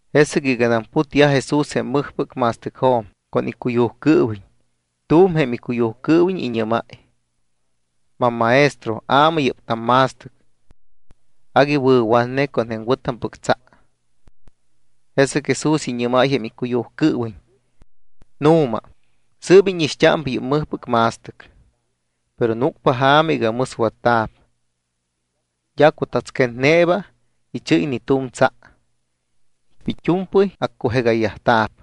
Jesɨc iganam putyaj Jesús jém mɨjpɨc ma̱stɨcjo̱m con icuyujcɨɨwiñ, tu̱m jém icuyujcɨɨwiñ iñɨ́máy: —Mammaestro, aamɨ yɨ́p tamma̱stɨc. Agui wɨ̱watne con jém wɨ̱tampɨc tsa. Jesɨc Jesús iñɨ́máy jém icuyujcɨɨwiñ: —Nu̱ma, sɨɨp íñixt́ámpa yɨ́p mɨjtampɨc ma̱stɨc, pero núcpa ja̱ma iga mɨswatta̱p. D́a cutatsquetneeba ichɨ́y ni tu̱m tsa. It́u̱mpɨy accujegayyajta̱p.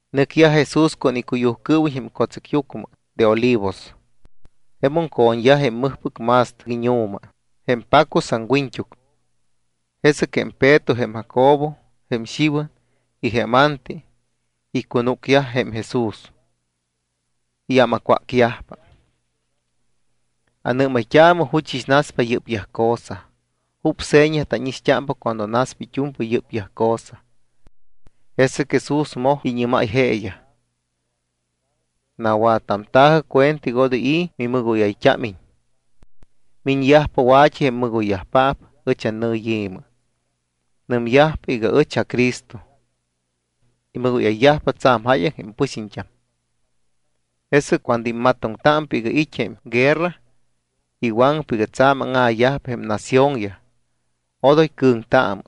Nɨcyaj Jesús con icuyujcɨɨwiñ jém co̱tsɨcyucmɨ de Olivos. Jemum co̱ñyaj jém mɨjpɨc ma̱stɨc iñu̱ma, jém pacus aŋwiñt́uc. Jesɨc jém Peto, jém Jacobo, jém Xiwan y jém Anti icunúcyaj jém Jesús. Iyámacwácyajpa: —¿Anɨ́mayt́aamɨ juchɨs naspa yɨ́pyaj cosa? ¿Jup seña tánixt́ámpa cuando naspa it́u̱mpɨy yɨ́pyaj cosa? Jesɨc Jesús moj iñɨ́máy jeeyaj: —Nawattamta̱jɨ cuenta iga odoy i̱ mimɨgóyayt́ámiñ. Miñyajpa wa̱t́i jém mɨgoyyajpaap ɨch annɨyi̱mɨ. Nɨmyajpa iga: “Ɨch aCristo.” Imɨgóyayyajpa tsa̱m jáyaŋ jém pɨxiñt́am. ’Jesɨc cuando immatoŋtámpa iga it́ jém guerra y waŋpa iga tsa̱m áŋa̱yajpa jém naciónyaj, odoy cɨ̱ŋtaamɨ;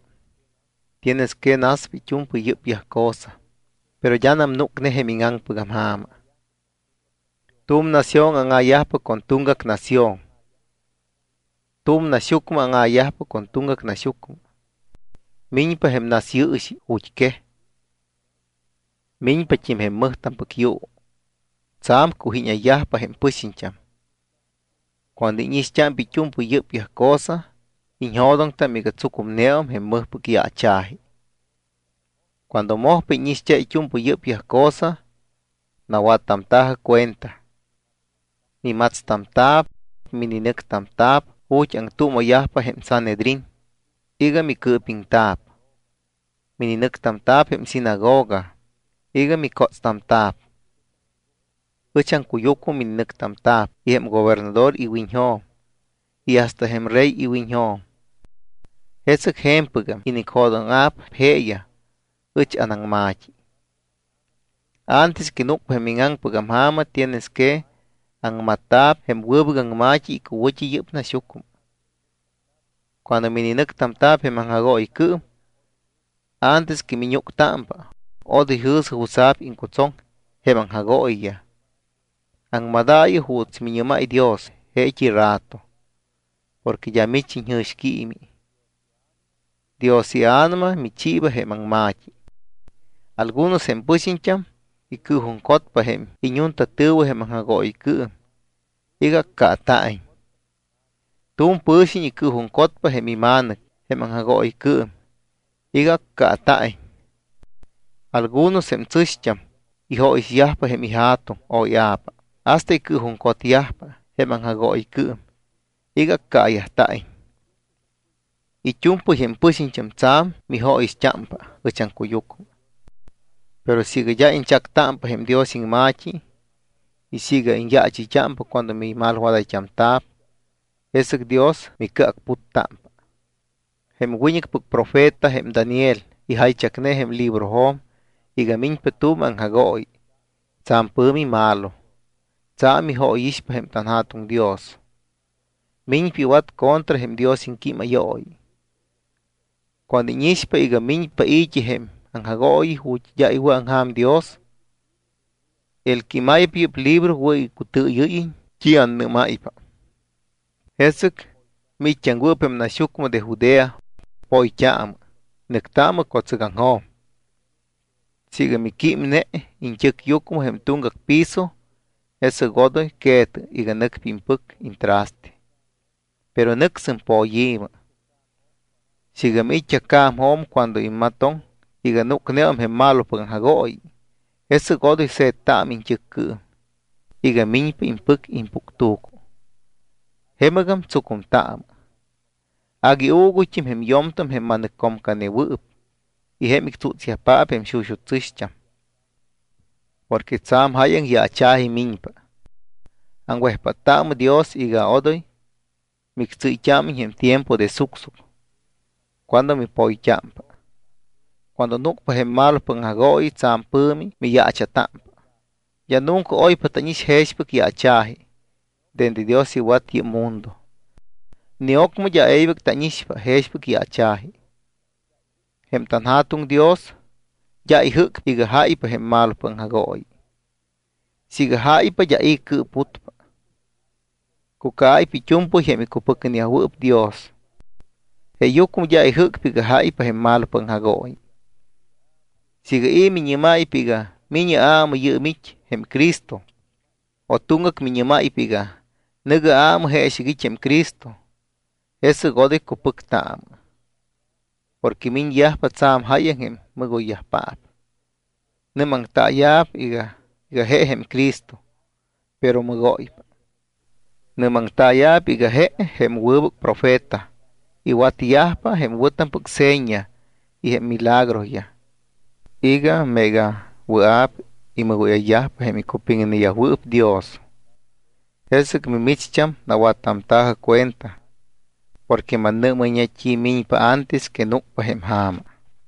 tienes que naspa it́u̱mpɨy yɨ́pyaj cosa, pero d́anam núcne jém íŋaŋpɨgam ja̱ma. Tu̱m nación áŋa̱yajpa con tuŋgac nación. Tu̱m naxyucmɨ áŋa̱yajpa con tuŋgac naxyucmɨ. Miñpa jém nasyɨɨxi ju̱t́quej. Miñpat́im jém mɨjtampɨc yuu. Tsa̱m cujíñayyajpa jém pɨxiñt́am. Cuando íñixt́ámpa it́u̱mpɨy yɨ́pyaj cosa, iñjo̱doŋtam iga tsucumneum jém mɨjpɨc yaacha̱ji. ’Cuando mojpa íñixt́a it́u̱mpɨy yɨ́pyaj cosa, nawattamta̱jɨ cuenta. Mimatstamta̱p, mininɨctamta̱p ju̱t́ aŋtuuma̱yajpa jém Sanhedrín iga micɨɨpiŋta̱p. Mininɨctamta̱p jém sinagoga iga micótstamta̱p. Ɨch aŋcuyucmɨ mininɨctamta̱p jém gobernador iwiñjo̱m y hasta jém rey iwiñjo̱m. Jesɨc je̱mpɨgam inicjo̱dóŋa̱p jeeyaj ɨch anaŋma̱t́i. Antes que núcpa jém íŋaŋpɨgam ja̱ma, tienes que aŋmatta̱p jém wɨbɨc aŋma̱t́i icuwɨ̱t́i yɨ́p naxyucmɨ. Cuando mininɨctamta̱p jém aŋjagooyicɨɨm, antes que miñúctámpa, odoy jɨ̱sɨ jutsa̱p iŋcutsoŋ jém aŋjagooyiyaj. Aŋmadaayɨ juuts miñɨ́máy Dios jeet́i rato porque d́a mich iñjɨ̱xquiimi. Dios iA̱nama michiiba jém aŋma̱t́i. Algunos jém pɨxiñt́am icɨɨjuŋcotpa jém iñuntatɨ̱wɨ jém aŋjagooyicɨɨm iga accaata̱iñ. Tu̱m pɨ̱xiñ icɨɨjuŋcotpa jém ima̱nɨc jém aŋjagooyicɨɨm iga accaata̱iñ. Algunos jém tsɨ̱xt́am ijóyixyajpa jém ija̱tuŋ o ia̱pa hasta icɨɨjuŋcotyajpa jém aŋjagooyicɨɨm iga accaayajta̱iñ. It́u̱mpɨy jém pɨxiñt́am tsa̱m mijóyixt́ámpa ɨch aŋcuyucmɨ. Pero siiga d́a iñchactámpa jém Dios iŋma̱t́i y siiga iñyaachɨ́ypa cuando mimalwadayt́amta̱p, jesɨc Dios micɨacputtámpa. ’Jém wiñɨcpɨc profeta, jém Daniel, ijaychac jém librojo̱m iga miñpa tu̱m aŋjagooyi tsa̱m pɨ̱mi malo, tsa̱m ijóyixpa tanJa̱tuŋ Dios. Miñpa iwat contra jém Dios iŋquímayooyi. Cuando íñixpa iga miñpa i̱t́i jém aŋjagooyi ju̱t́ d́a iwɨ̱aŋja̱m Dios (el que imaypa yɨ́p libro wɨ̱ iga icutɨɨyɨ́yiñ t́i annɨ́máypa), jesɨc miit́t́aŋwɨɨp jém naxyucmɨ de Judea, poyt́aamɨ, nɨctaamɨ co̱tsɨgaŋjo̱m. Siiga miquímne iñt́ɨcyucmɨ jém tuŋgac piso, jesɨc odoy que̱tɨ iga nɨcpa impɨc iñtraste, pero nɨcsɨm poyi̱mɨ. Siiga miit́t́a ca̱mjo̱m cuando immatoŋ iga núcneum jém malopɨc aŋjagooyi, jesɨc odoy se̱ttaamɨ iñt́ɨccɨɨm iga miñpa impɨc impuctu̱cu. Jemɨgam tsucumtaamɨ. Agui uuguyt́im jém yo̱mtam jém ma̱nɨccomcaneyajwɨɨp y jém ictsútsyajpaap jém xuxut́ tsɨ̱xt́am. Porque tsa̱m jáyaŋ yaacha̱ji miñpa. Aŋwejpáttaamɨ Dios iga odoy mictsɨ́yt́ámiñ jém tiempo de sucsuc cuando mipoyt́ámpa. Cuando núcpa jém malopɨc aŋjagooyi, tsa̱m pɨ̱mi miyaacha̱támpa. D́a nunca oypa tánix jexpɨc yaacha̱ji dende Dios iwat yɨ́p mundo. Ni ocmɨ d́a e̱ybɨc tánixpa jexpɨc yaacha̱ji. Jém tanJa̱tuŋ Dios d́a ijɨ́cpa iga jáypa jém malopɨc aŋjagooyi. Siiga jáypa, d́a i̱ cɨɨputpa, cucaayyajpa it́u̱mpɨy jém icupiŋneyajwɨɨp Dios. Jeeyucmɨ d́a ijɨ́cpa iga jáypa jém malopɨc aŋjagooyi. ’Siiga i̱ miñɨ́máypa iga: “Mi̱ñɨ aamɨ, yɨɨm it́ jém Cristo”, o tuŋgac miñɨ́máypa iga: “Nɨ̱gɨ aamɨ, jeexɨc it́ jém Cristo”, jesɨc odoy cupɨctaamɨ. Porque miñyajpa tsa̱m jáyaŋ jém mɨgoypaap. Nɨ́maŋtaaya̱p iga je jém Cristo, pero mɨgóypa. Nɨ́maŋtaaya̱p iga je jém wɨbɨc profeta. Iwatyajpa jém wɨ̱tampɨc seña y jém milagroyaj iga meega wɨa̱p imɨgóyayyajpa jém icupiŋneyajwɨɨp Dios. Jesɨc mimicht́am nawattamta̱jɨ cuenta porque mannɨ́mayñe t́i miñpa antes que núcpa jém ja̱ma.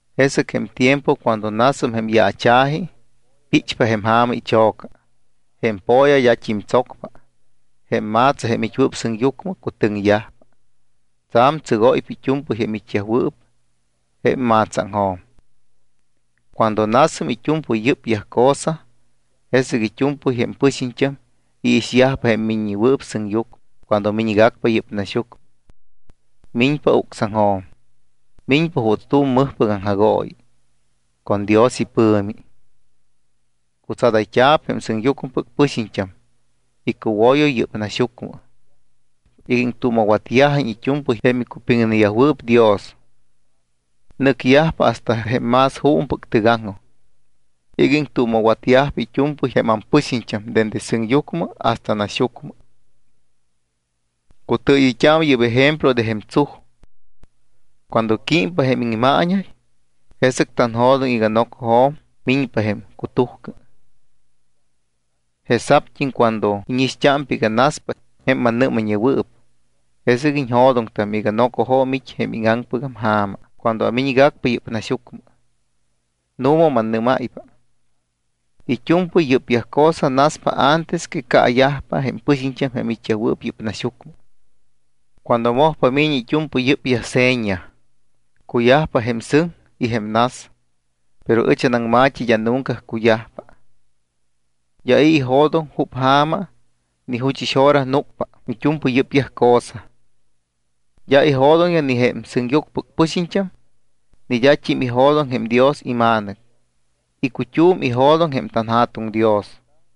’Jesɨc jém tiempo cuando nasum jém yaacha̱ji, píchpa jém ja̱ma icho̱ca. Jém po̱ya d́at́im tsocpa. Jém ma̱tsa jém it́wɨɨp sɨŋyucmɨ, cutɨŋyajpa. Tsa̱m tsɨgóypa it́u̱mpɨy jém it́yajwɨɨp jém ma̱tsaaŋjo̱m. Cuando nasum it́u̱mpɨy yɨ́pyaj cosa, jesɨc it́u̱mpɨy jém pɨxiñt́am iixyajpa jém Miññewɨɨp Sɨŋyucmɨ cuando miñgacpa yɨ́p naxyucmɨ. Miñpa ucsaŋjo̱m. Miñpa juuts tu̱m mɨjpɨc aŋjagooyi con Dios ipɨ̱mi. Cutsadayt́a̱p jém sɨŋyucmɨpɨc pɨxiñt́am icuwoyo yɨ́p naxyucmɨ iga iŋtuuma̱watyajiñ it́u̱mpɨy jém icupiŋneyajwɨɨp Dios. Nɨcyajpa hasta jém más juumɨpɨc tɨgaŋjoj iga iŋtuuma̱watyajpa it́u̱mpɨy jém ampɨxiñt́am dende sɨŋyucmɨ hasta naxyucmɨ. ’Cutɨɨyɨyt́aamɨ yɨ́p ejemplo de jém tsuj. Cuando químpa jém iŋmaañay, jesɨc tanjo̱doŋ iga nocojo̱m miñpa jém cutujcɨ. Jesa̱pt́im cuando íñixt́ámpa iga naspa jém mannɨ́mayñewɨɨp, jesɨc iñjo̱doŋtam iga nocojo̱m it́ jém íŋaŋpɨc ja̱ma cuando amiñgacpa yɨ́p naxyucmɨ. Nu̱ma, mannɨ́máypa, it́u̱mpɨy yɨ́pyaj cosa naspa antes que caayajpa jém pɨxiñt́am jém it́yajwɨɨp yɨ́p naxyucmɨ cuando mojpa mi̱ñi it́u̱mpɨy yɨ́pyaj seña. Cuyajpa jém sɨŋ y jém nas, pero ɨch anaŋma̱t́i d́a nunca cuyajpa. ’D́a i̱ ijo̱doŋ jup ja̱ma ni juchɨs hora núcpa it́u̱mpɨy yɨ́pyaj cosa. D́a ijo̱doŋyaj ni jém sɨŋyucmɨpɨc pɨxiñt́am ni d́at́im ijo̱doŋ jém Dios iMa̱nɨc. Icut́um ijo̱doŋ jém tanJa̱tuŋ Dios.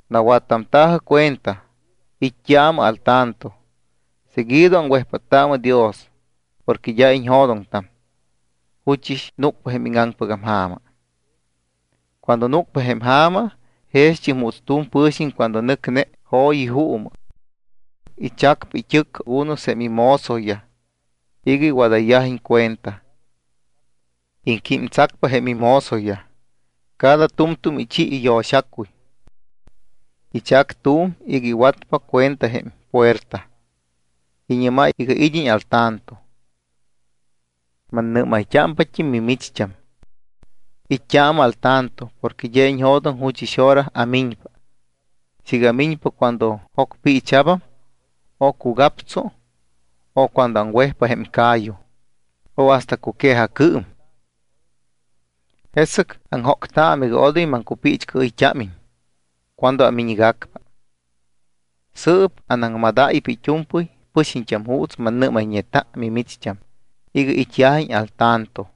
’Nawattamta̱jɨ cuenta, it́t́aamɨ al tanto, seguido aŋwejpáttaamɨ Dios porque d́a iñjo̱doŋtam juchɨs núcpa jém íŋaŋpɨc ja̱ma. Cuando núcpa jém ja̱ma jext́im juuts tu̱m pɨ̱xiñ cuando nɨcne jo̱yi juumɨ. Ichacpa it́ɨc con algunos jém imozoyaj iga iwadáyiñ cuenta. Iŋquímtsacpa jém imozoyaj. Cada tu̱mtu̱m ichi iyo̱xacuy. Ichac tu̱m iga iwatpa cuenta jém puerta. Iñɨ́máy iga id́iñ al tanto. Mannɨ́mayt́ámpat́im mimicht́am, it́t́aamɨ al tanto porque d́a iñjo̱doŋtam juchɨs hora amiñpa, siiga amiñpa cuando jocpiicha̱bam, o cugaptsu, o cuando aŋwejpa jém ca̱yu, o hasta cuque̱jacɨɨm. Jesɨc aŋjóctaamɨ iga odoy maŋcupiichcɨɨyt́ámiñ cuando amiñgacpa. Sɨɨp anaŋmadáypa it́u̱mpɨy pɨxiñt́am juuts mannɨ́mayñeta mimicht́am iga it́yajiñ al tanto.